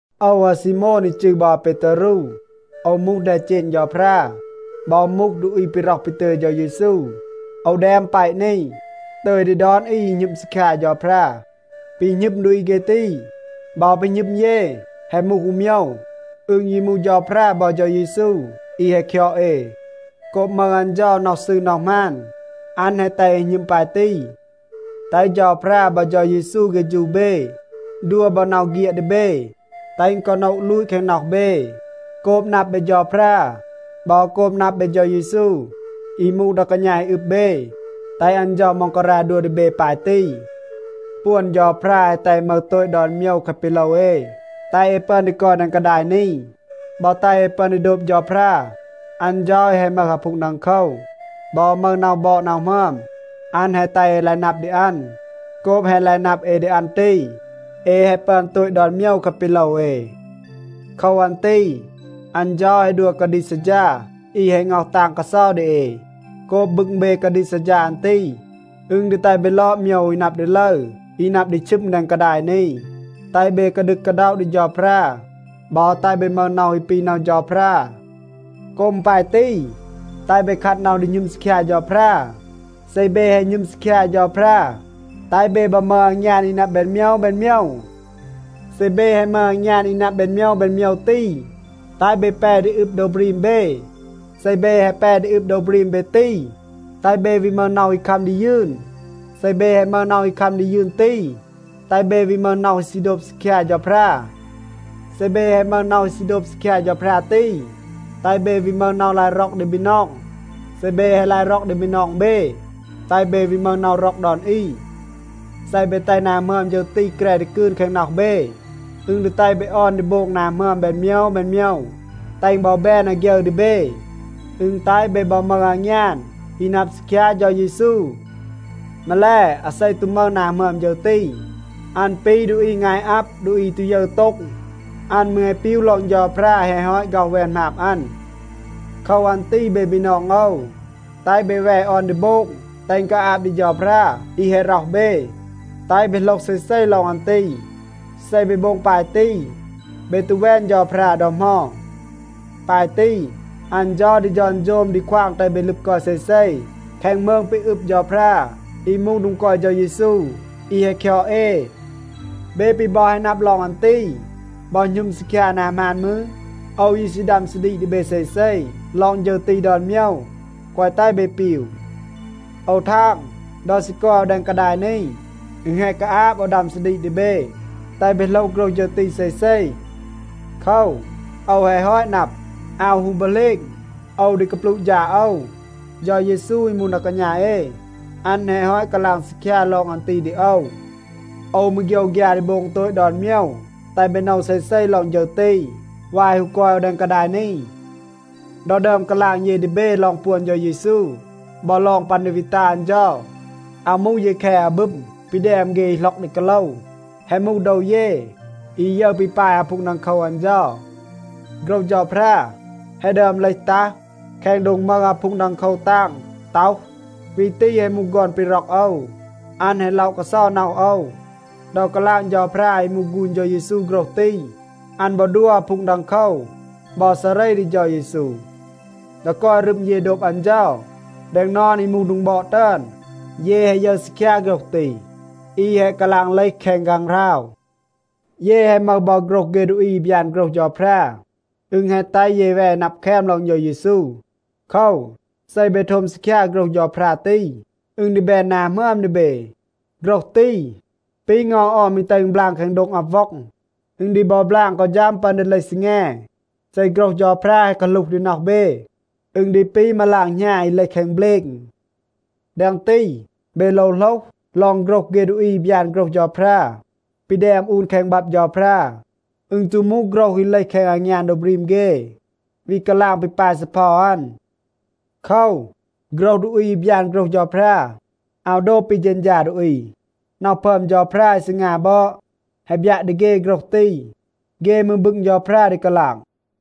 โอว อาซีโมน อี จืร บอ อาเปตารู, โอว มูห แดเจณ เฌาพรา บอ มูห ดูอี ปี ร็อห ปี ตึย เฌา เยซู. โอว แดม แปะ นี ตึย ดี ดอน อี อี หณึม ซีคยา เฌาพรา. ปี หณึม ดูอี เฆ ตี บอ ปี หณึม เย แฮะ มูห อู โมยว. อึณ ยี มูห เฌาพรา บอ เฌา เยซู อี แฮะ คยอด เอ. โกบ มึห อัน เฌา น็อห ซืร น็อห หมาน, อัน แฮะ แตห เอ หณึม ปาย ตี. แตห เฌาพรา บอ เฌา เยซู เฆฌู เบ, ดัว บอ น็อห เฆียด ดี เบ, แตห อึณ กอ โนะ ลูต แคง น็อห เบ. โกบ นับ เบ เฌาพรา บอ โกบ นับ เบ เฌา เยซู อี มูห ดา กาณา อี อึบ เบ, แตห อัน เฌา ม็องการา ดัว ดี เบ ปาย ตี. ปวน เฌาพรา แฮะ แตห เอ มึห โตต ดอน โมยว แคะ ปี โลว เอ, แตห เอ ปึอน ดี กอย แดง กาดาย นี บอ แตห เอ ปึอน ดี โดบ เฌาพรา. อัน เฌา อี แฮะ มึห อาพูง ดังโคว บอ มึห น็อห บอด น็อห หมึอม, อัน แฮะ แตห เอ ลาย นับ ดี อัน. โกบ แฮะ ลาย นับ เอ ดี อัน ตี, เอ แฮะ ปึอน โตต ดอน โมยว แคะ ปี โลว เอ. โคว อัน ตี อัน เฌา แฮะ ดัว กาดีก ซัดฌา อี แฮะ ง็อห ตาง กาเซา ดี เอ. โกบ บึง เบ กาดีก ซัดฌา อัน ตี, อึณ ดี แตห เบ ลอด โมยว อี นับ ดี ลึร, อี นับ ดี ชึม แดง กาดาย นี, แตห เบ กาดึก กาด็อะ ดี เฌาพรา บอ แตห เบ มึห น็อห อี ปี น็อห เฌาพรา. โกบ อึณ ปาย ตี, แตห เบ คัด น็อห ดี หณึม ซีคยา เฌาพรา. เซ เบ แฮะ หณึม ซีคยา เฌาพรา, แตห เบ บอ มึห อางยาน อี นับ แบน โมยว แบน โมยว. เซ เบ แฮะ มึห อางยาน อี นับ แบน โมยว แบน โมยว ตี, แตห เบ แป ดี อึบ โดว บรีม เบ. เซ เบ แฮะ แป ดี อึบ โดว บรีม เบ ตี, แตห เบ วี มึห น็อห อี คัม ดี ยืน. เซ เบ แฮะ มึห น็อห อี คัม ดี ยืน ตี, แตห เบ วี มึห น็อห ซี โดบ ซีคยา เฌาพรา. เซ เบ แฮะ มึห น็อห อี ซี โดบ ซีคยา เฌาพรา ตี, แตห เบ วี มึห น็อห ลาย ร็อก ดี บีนอง. เซ เบ แฮะ ลาย ร็อก ดี บีนอง เบ, แตห เบ วี มึห น็อห ร็อก ดอน อี. เซ เบ แตห นา หมึอม ฌึร ตี แกร ดี กืน แคง น็อห เบ, อึณ ดี แตห เบ ออน ดี โบง นา หมึอม แบน โมยว แบน โมยว, แตห อึณ บอ แบน อาฆยึร ดี เบ. อึณ แตห เบ บอ มึห อางยาน อี นับ ซีคยา เฌา เยซู. มาแล, อาเซ ตู มึห นา หมึอม ฌึร ตี, อัน ปี ดูอี งาย อับ, ดูอี อี ตู ยึร โต็ง. อัน มืร แฮะ ปีว ลอง เฌาพรา แฮะ ฮอต ฆ็อห แวน หมาบ อัน. โคว อัน ตี เบ บีนอง โอว, แตห เบ แว ออน ดี โบง แตห อึณ กาอาบ ดี เฌาพรา อี แฮะ ร็อห เบ, แตห เบ โหลห เซเซ ลอง อัน ตี. เซ เบ โบง ปาย ตี, เบ ตู แวน เฌาพรา ดอ เหมา. ปาย ตี, อัน เฌา ดี ฌอนโฌม ดี ควาง แตห เบ ลึบ กอย เซเซ แคง มืง ปี อึบ เฌาพรา อี มูห โดง กอย เฌา เยซู อี แฮะ คยอด เอ. เบ ปี บอ แฮะ นับ ลอง อัน ตี บอ หณึม ซีคยา นา หมาน มืร, โอว ยี ซี ดัม ซาดีก ดี เบ เซเซ ลอง ฌึร ตี ดอน โมยว, แกวะ แตห เบ ปีว. โอว ทาง, ดอ ซี กอย โอว แดง กาดาย นี, อึณ แฮะ กาอาบ โอว ดัม ซาดีก ดี เบ, แตห เบ โหลห โฆรห ฌึร ตี เซเซ. โคว, โอว แฮะ ฮอต นับ, อาว ฮู บอ เหลณ โอว ดี กาปลูะ ฌาด โอว. เฌา เยซู อี มูห ดา กาณา เอ, อัน แฮะ ฮอต กาลาง ซีคยา ลอง อัน ตี ดี โอว. โอว มืร โฆยวฆยา ดี โบง โตต ดอน โมยว, แตห เบ โนว เซเซ ลอง ฌึร ตี วาย ฮู กอย โอว แดง กาดาย นี. ดอ ดึอม กาลาง เย ดี เบ ลอง ปวน เฌา เยซู บอ ลอง ปัน ดี วี ตัห อัน เฌา, อาว มูห เย แค อาบึม ปี แดม เฆ อี หล็อก ดี กาโลว. แฮะ มูห โดว เย อี ยึร ปี ปาย อาพูง ดังโคว อัน เฌา. โฆรห เฌาพรา แฮะ ดึอม เลห ตัห แคง โดง มึห อาพูง ดังโคว ตาง ต็อห, “วี ตี แฮะ มูห ฆอน ปี ร็อก โอว. อัน แฮะ ล็อะ กาเซา น็อห โอว.” ดอ กาลาง เฌาพรา อี มูห ฆูณ เฌา เยซู โฆรห ตี, อัน บอ ดัว อาพูง ดังโคว บอ ซาเร ดี เฌา เยซู. ดอ กอย รึม เย โดบ อัน เฌา แดง นอน อี มูห โดง บอด ตึอน, เย แฮะ ยึร ซีคยา โฆรห ตี อี แฮะ กาลาง เลห แคง ฆางหราว. เย แฮะ มึห บอ โฆรห เฆ ดูอี อี บยาน โฆรห เฌาพรา. อึณ แฮะ แตห เย แว นับ แคม ลอง เฌา เยซู. โคว, เซ เบ โทม ซีคยา โฆรห เฌาพรา ตี, อึณ ดี แบน นา หมึอม ดี เบ. โฆรห ตี, ปี เงา ออม อี แตห อึณ บลาง แคง โดง อับ ว็อง. อึณ ดี บอ บลาง กอ ฌัม ปัน ดี เลห ซีแง. เซ โฆรห เฌาพรา แฮะ กาหลูห ดี น็อห เบ, อึณ ดี ปี มาลาง หณา อี เลห แคง เบลณ. แดง ตี, เบ โลว โหลห ลอง โฆรห เฆ ดูอี อี บยาน โฆรห เฌาพรา ปี แดม อูน แคง บับ เฌาพรา. อึณ ตู มูห โฆรห อี เลห แคง อางยาน โดว บรีม เฆ, วี กาลาง ปี ปาย ซีเพา อัน. โคว, โฆรห ดูอี อี บยาน โฆรห เฌาพรา อาว โดบ ปี เฌณฌา ดูอี. น็อห พึอม เฌาพรา อี ซีงา บอด แฮะ บยัะ ดี เฆ โฆรห ตี. เฆ มืร บึง เฌาพรา ดี กาลาง.